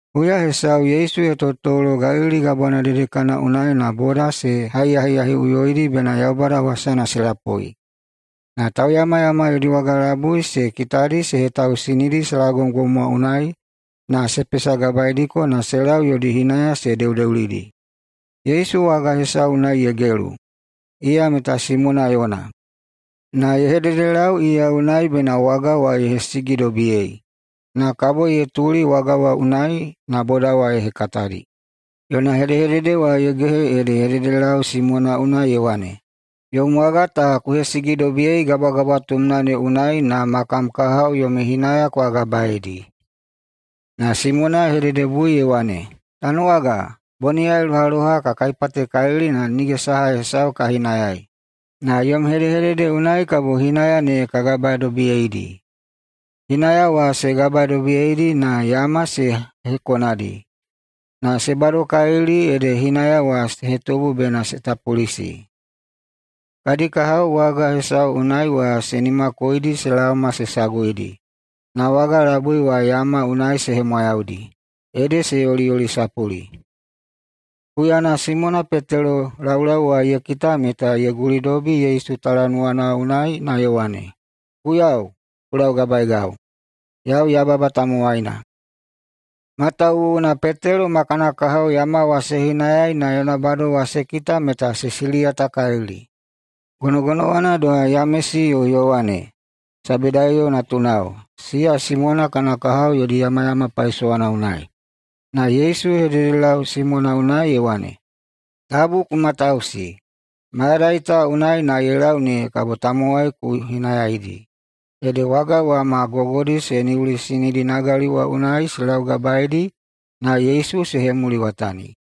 Huya hesau Yesu ye totolo Galili Gabwana dedekana unai na boda se haiyahiyahiꞌuyoidi bena Yaubada wasana se lapui. Na tauyamayama yodi waga labui ye kitadi se hetausinidi salagomgom wa unai na se pesagabaeidiko na se lau yodi hinaya se deudeulidi. Yesu waga wa hesau unai ye gelu, iya meta Simona yona. Na ye hededelau iya unai bena waga wa ye hesigidobiyei. Na kabo ye tuli waga wa unai na boda wa ye hekatadi. Yona hedehedede wa ye gehe ede ye hededelau Simona unai ye wane, “Yom waga ta ku hesigidobiyei gabwagabwatumna ne unai, na ma kam kahao yomi hinaya kwa gabaeidi.” Na Simona ye hededebui ye wane, “Tanuwaga, boniyai lohaloha ka kaipatekalili na nige saha hesau ka hinayai, na yom hedehedede unai kabo hinaya ne ya gabadobiyeidi.” Hinaya wa se gabadobiyeidi na yama se hekonadi. Na se badokalili ede hinaya wa se hetubu bena se tapulisi. Unai kadi kahao waga hesau unai wa se nimakoidi se laoma se saguidi. Na waga labui wa yama unai se hemwayaudi, ede se yoliyolisapuli. Huyana Simona Petelo laulau wa ye kita meta ye gulidobi Yesu talanuwana unai na ye wane, “Guiyau, ku laugabaegau, yau yababa tamowaina.” Matawuwuna Petelo ma kana kahao yama wa se hinayai na yona bado wa se kita meta se siliyatakalili, gonogonowana doha Yamesi yo Yowane, Sebedaiyo natunao, siya Simona kana kahao yodi yamayama paisowana unai. Na Yesu ye hededelau Simona unai ye wane, “Tabu ku matausi, mayadai ta unai na ye lau ne kabo tamowai ku hinayaidi.” Ede waga wa ma gogodi se niulisinidi nagali wa unai se laugabaeidi na Yesu se hemuliwatani.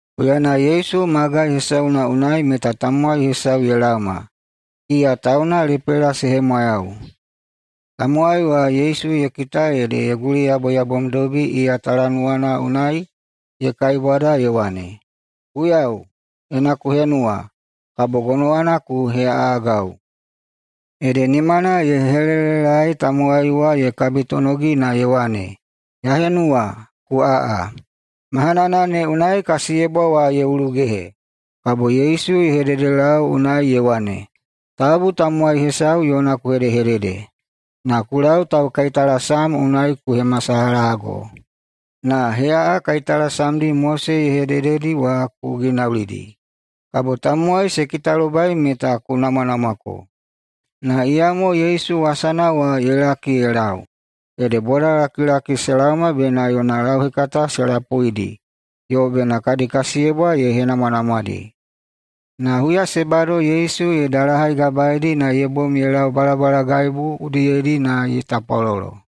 Huyana Yesu magai hesauna unai meta tamowai hesau ye laoma, iya tauna lepela se hemwayau. Tamowai wa Yesu ye kita ede ye guliyaboyabomdobi iya talanuwana unai na ye kaibwada ye wane, “Guiyau, ena ku henuwa, kabo gonowana ku heꞌaꞌagau.” Ede nimana ye helelelaei tamowai wa ye kabitonogi na ye wane, “Ya henuwa. Ku aꞌa.” Mahanana ne unai kasiyebwa wa ye ulugehe. Kabo Yesu ye hedehededelau unai ye wane, “Tabu tamowai hesau yona ku hedehedede, na ku lau taukaitalasam unai ku hemasalahago, na heꞌaꞌa kaitalasamdi Mose ye hedededi wa ku ginaulidi. Kabo tamowai se kitalobai meta ku namwanamwako.” Na iyamo Yesu wasana wa ye laki ye lau, ede bodalakilaki se laoma bena yona lauhekata se lapuidi yo bena kadi kasiyebwa ye henamwanamwadi. Na huya se bado Yesu ye dalahaigabaedi na ye bom ye lau balabalagaibu udiyedi na ye tapwalolo.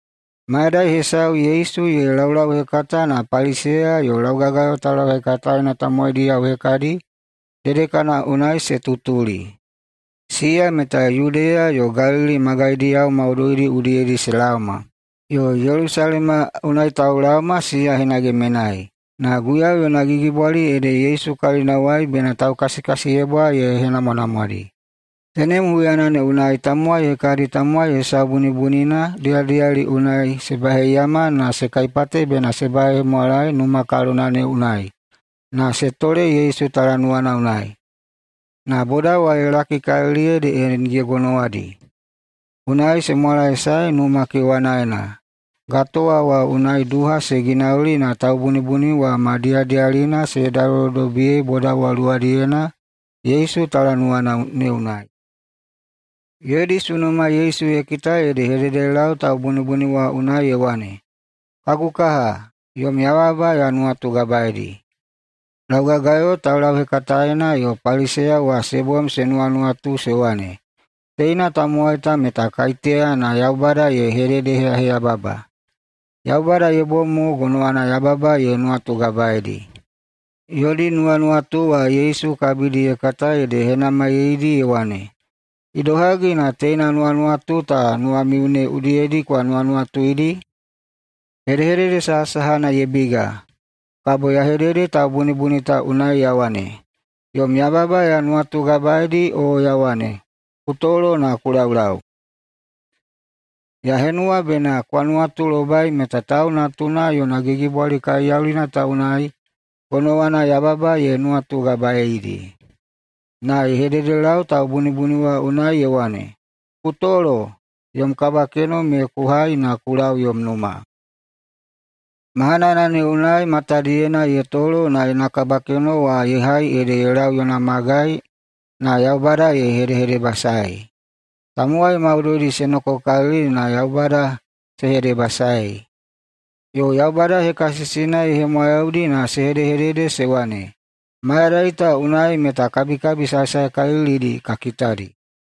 Mayadai hesau Yesu ye laulauhekata, na Paliseya yo laugagayo taulauhekataena tamowaidiyao hekadi dedekana wa unai se tutuli. Siya meta Yudeya yo Galili magaidiyao maudoidi udiyedi se laoma, yo Yelusalema unai taulaoma siya hinage menai. Na Guiyau yona gigibwali ede Yesu kalinawai bena taukasikasiyebwa ye henamwanamwadi. Tenem huyana ne unai meta tamowai hekadi tamowai hesau bunibunina diyadiyali unai se baheiyama na se kaipate bena se bahehemwalae numa kalona ne unai na se tole Yesu talanuwana unai. Na boda wa ye lakikalili ede nige gonowadi, unai se mwalaesae numa wa kewanaena, gatowa wa unai duha se ginauli na taubunibuni wa ma diyadiyalina se hedalolodobiyei boda wa luwadiyena Yesu talanuwana ne unai. Yodi sunuma Yesu ye kita ede ye hededelau taubunibuni wa unai ye wane, “Kagu kaha, yom yababa ya nuwatugabaeidi.” Laugagayo taulauhekataena yo Paliseya wa se bom se nuwanuwatu se wane, “Teina tamowai ta meta kaiteya na Yaubada ye hededeheyaheyababa? Yaubada ye bom mo gonowana yababa ye nuwatugabaedi!” Yodi nuwanuwatu wa Yesu kabidi ye kata ede ye henamaiyeidi ye wane, “Idohagi na teina nuwanuwatu ta nuwamiu ne udiyedi kwa nuwanuwatuidi? Hedehedede sahasahana ye biga, kabo ya hedede taubunibuni ta unai ya wane, ‘Yom yababa ya nuwatugabaedi’, o ya wane, ‘Ku tolo na ku laulau’? Ya henuwa bena kwa nuwatulobai meta Tau Natuna yona gigibwali kaiyaulina ta unai gonowana yababa ye nuwatugabaedi.” Na ye hededelau taubunibuni wa unai ye wane, “Ku tolo, yom kabakeno me ku hai na ku lau yom numa!” Mahanana ne unai matadiyena ye tolo na yona kabakeno wa ye hai ede ye lau yona magai na Yaubada ye hedehedebasaei. Tamowai maudoidi se nokokalili na Yaubada se hedebasaei. Yo Yaubada hekasisina ye hemwayaudi na se hedehedede se wane, “Mayadai ta unai meta kabikabi saesaekalilidi ta kitadi.”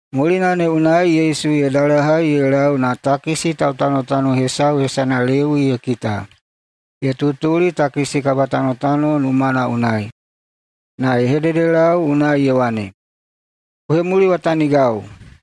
Mulina ne unai Yesu ye dalahai ye lau na takisi tautanotano hesau hesana ede Lewi ye kita ye tutuli takisi kabatanotano numana unai. Na ye hededelau unai ye wane, “Ku hemuliwatanigau!”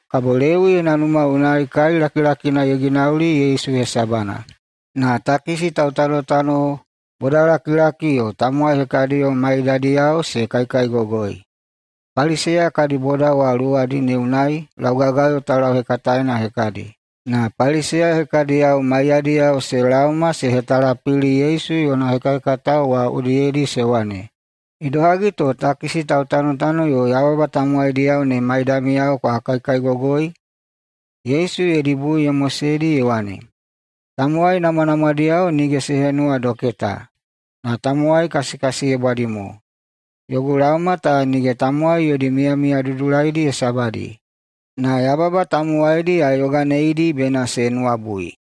Kabo Lewi yona numa unai kai lakilakina ye ginauli Yesu hesabana. Na takisi tautanotano bodalakilaki yo tamowai hekadiyo maiyadiyao se kaikaigogoi. Paliseya kadi bodao wa luwadi ne unai laugagayo taulauhekataena hekadi, na Paliseya hekadiyo maiyadiyao [se laoma] se hetalapili Yesu yona hekahekatao wa udiyedi se wane, “Idohagi to takisi tautanotano yo yababa tamowaidiyao ne maidamiyao kwa kaikaigogoi?” Yesu yodi bui ye moseidi ye wane, “Tamowai namwanamwadiyao nige se henuwa doketa, na tamowai kasikasiyebwadi mo. Yogu laoma ta nige tamowai yodi miyamiya dudulaidi hesabadi, na yababa tamowaidi ya yoganeidi bena se nuwabui.”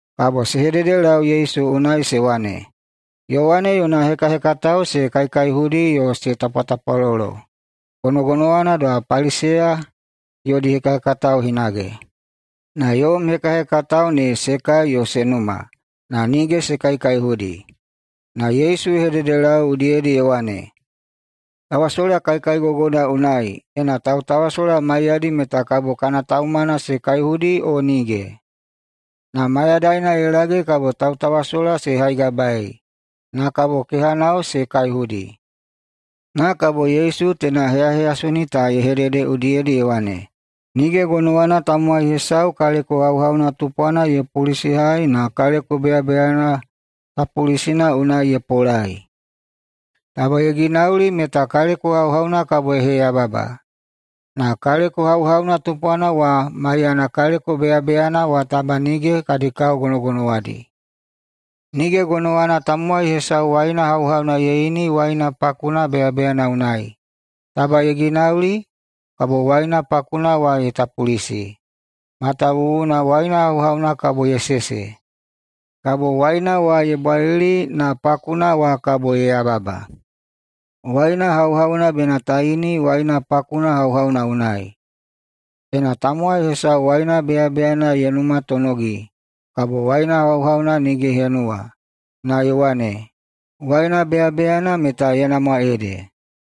Kabo se hededelau Yesu unai se wane, “Yowane yona hekahekatao se kaikaihudi yo se tapwatapwalolo, gonogonowana doha Paliseya yodi hekahekatao hinage, na yom hekahekatao ne se kai yo se numa, [na nige se kaikaihudi].” Na Yesu ye hededelau udiyedi ye wane, “Tawasola kaikaigogona unai, ena tautawasola maiyadi, meta kabo kana taumana se kaihudi o nige? Na mayadaina ye lage kabo tautawasola se haigabaei, na kabo kehanao ne se kaihudi.” Na kabo Yesu teina heyaheyasoni ta ye hedede udiyedi ye wane, “Nige gonowana tamowai hesau kaleko hauhauna tupwana ye pulisihai na kaleko beyabeyana tapulisina unai ye polai. Taba ye ginauli, meta kaleko hauhauna kabo ye heyababa, na kaleko hauhauna tupwana wa maiyana kaleko beyabeyana wa taba nige kadi kao ne gonogonowadi. Nige gonowana tamowai hesau waina hauhauna ye ini waina pakuna beyabeyana unai. Taba ye ginauli, kabo waina pakuna wa ye tapulisi, matawuwuna waina hauhauna kabo ye sese. Kabo waina wa ye bwalili, na pakuna wa kabo ye yababa. Waina hauhauna bena ta ini waina pakuna hauhauna unai. Ena tamowai hesau waina beyabeyana ye numatonogi, kabo waina hauhauna nige ye henuwa, na ye wane, ‘Waina beyabeyana meta ye namwa ede.’”